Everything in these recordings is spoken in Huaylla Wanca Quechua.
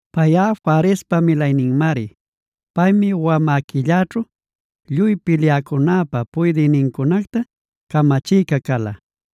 Payꞌa Farespa milayninmari. Paymi wamä quilläćhu lluy pilyäcunäpa puydïnincunacta camachïca cala.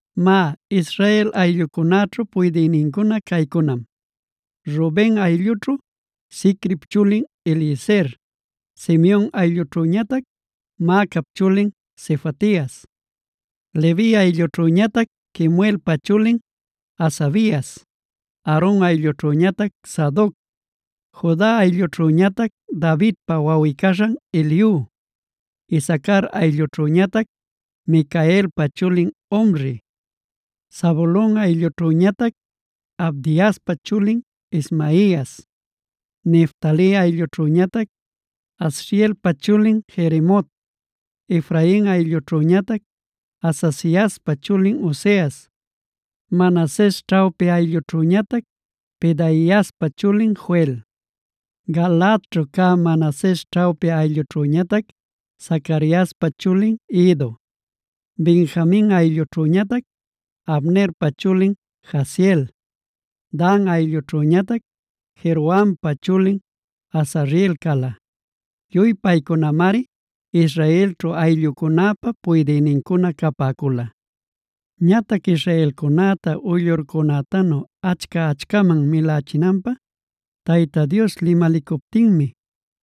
Má, Israel ayllucunäćhu puydïnincuna caycunam: Ruben ayllućhu: Zicrip chulin Eliezer, Simeon ayllućhüñatac Maacap chulin Sefatias, Levi ayllućhüñatac Kemuelpa chulin Hasabias, Aaron ayllućhüñatac Sadoc, Juda ayllućhüñatac Davidpa wawꞌi-caśhan Eliu, Isacar ayllućhüñatac Micaelpa chulin Omri, Zabulon ayllućhüñatac Abdiaspa chulin Ismaias, Neftali ayllućhüñatac Azrielpa chulin Jerimot, Efrain ayllućhüñatac Azaziaspa chulin Oseas, Manases ćhawpi ayllućhüñatac Pedaiaspa chulin Joel, Galaadćhu cä Manases ćhawpi ayllućhüñatac Zacariaspa chulin Iddo, Benjamin ayllućhüñatac Abnerpa chulin Jaasiel, Dan ayllućhüñatac Jerohampa chulin Azareel cala. Lluy paycunamari Israelćhu ayllucunäpa puydïnincuna capäcula. Ñatac israelcunäta uyllurcunätanu achca-achcaman milachinanpä Tayta Dios limalicuptinmi,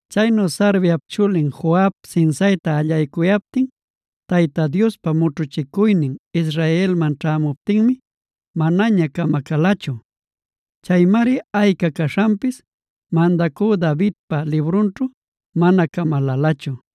Chaynu Sarviap chulin Joab sinsayta allaycuyaptin, Tayta Diospa mućhuchicuynin Israelman ćhämuptinmi manaña camacalachu.b Chaymari ayca caśhanpis mandacü Davidpa librunćhu mana camalälachu.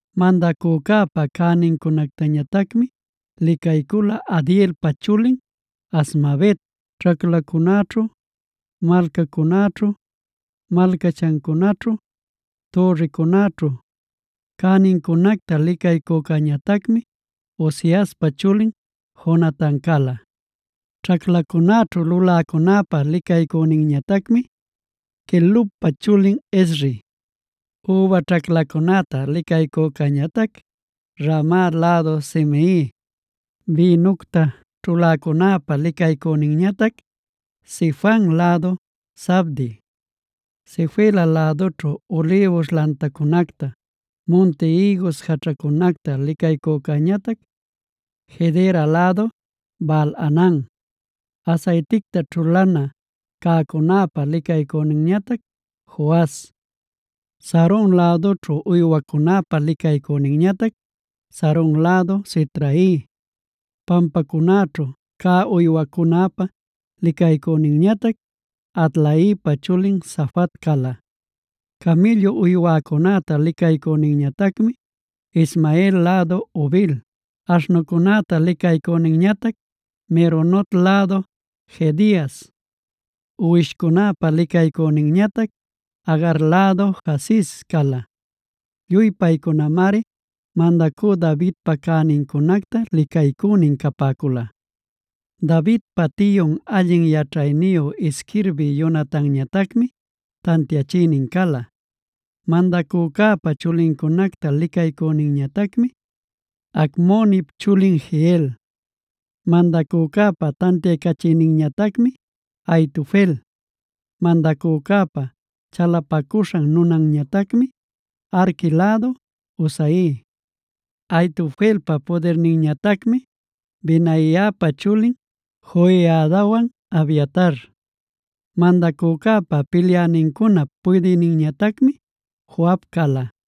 Mandacücäpa cänincunactañatacmi licaycula Adielpa chulin Azmavet. Ćhaclacunäćhu, malcacunäćhu, malcachancunäćhu, türricunäćhu cänincunacta licaycücäñatacmi Uziaspa chulin Jonatan cala. Ćhaclacunäćhu luläcunäpa licaycüninñatacmi Quelubpa chulin Ezri, üba ćhaclacunäta licaycücäñatac Ramat lädu Simei, bïnucta ćhuläcunäpa licaycüninñatac Sifan lädu Zabdi, Sefela lädućhu ulïbus lantacunacta munti ïgus jaćhacunacta licaycücäñatac Gedera lädu Baal-hanan, asayticta ćhulana cäcunäpa licaycüninñatac Joas, Saron lädućhu uywacunäpa licaycüninñatac Saron lädu Sitrai, pampacunäćhu cä uywacunäpa licaycüninñatac Adlaipa chulin Safat cala. Camïllu uywacunäta licaycüninñatacmi Ismael lädu Obil, aśhnucunäta licaycüninñatac Meronot lädu Jehedias, uwishcunäpa licaycüninñatac Agar lädu Jaziz cala. Lluy paycunamari mandacü Davidpa cänincunacta licaycünin capäcula. Davidpa tiyun allin yaćhayniyu isquirbï Jonatanñatacmi tantiachïnin cala. Mandacücäpa chulincunacta licaycüninñatacmi Hacmonip chulin Jehiel. Mandacucäpa tantiaycachïninñatacmi Ahitofel. Mandacücäpa chalapacuśhan nunanñatacmi Arqui lädu Husai. Ahitofelpa pudirninñatacmi Benaiapa chulin Joiadawan Abiatar. Mandacücäpa pilyänincunap puydïninñatacmi Joab cala.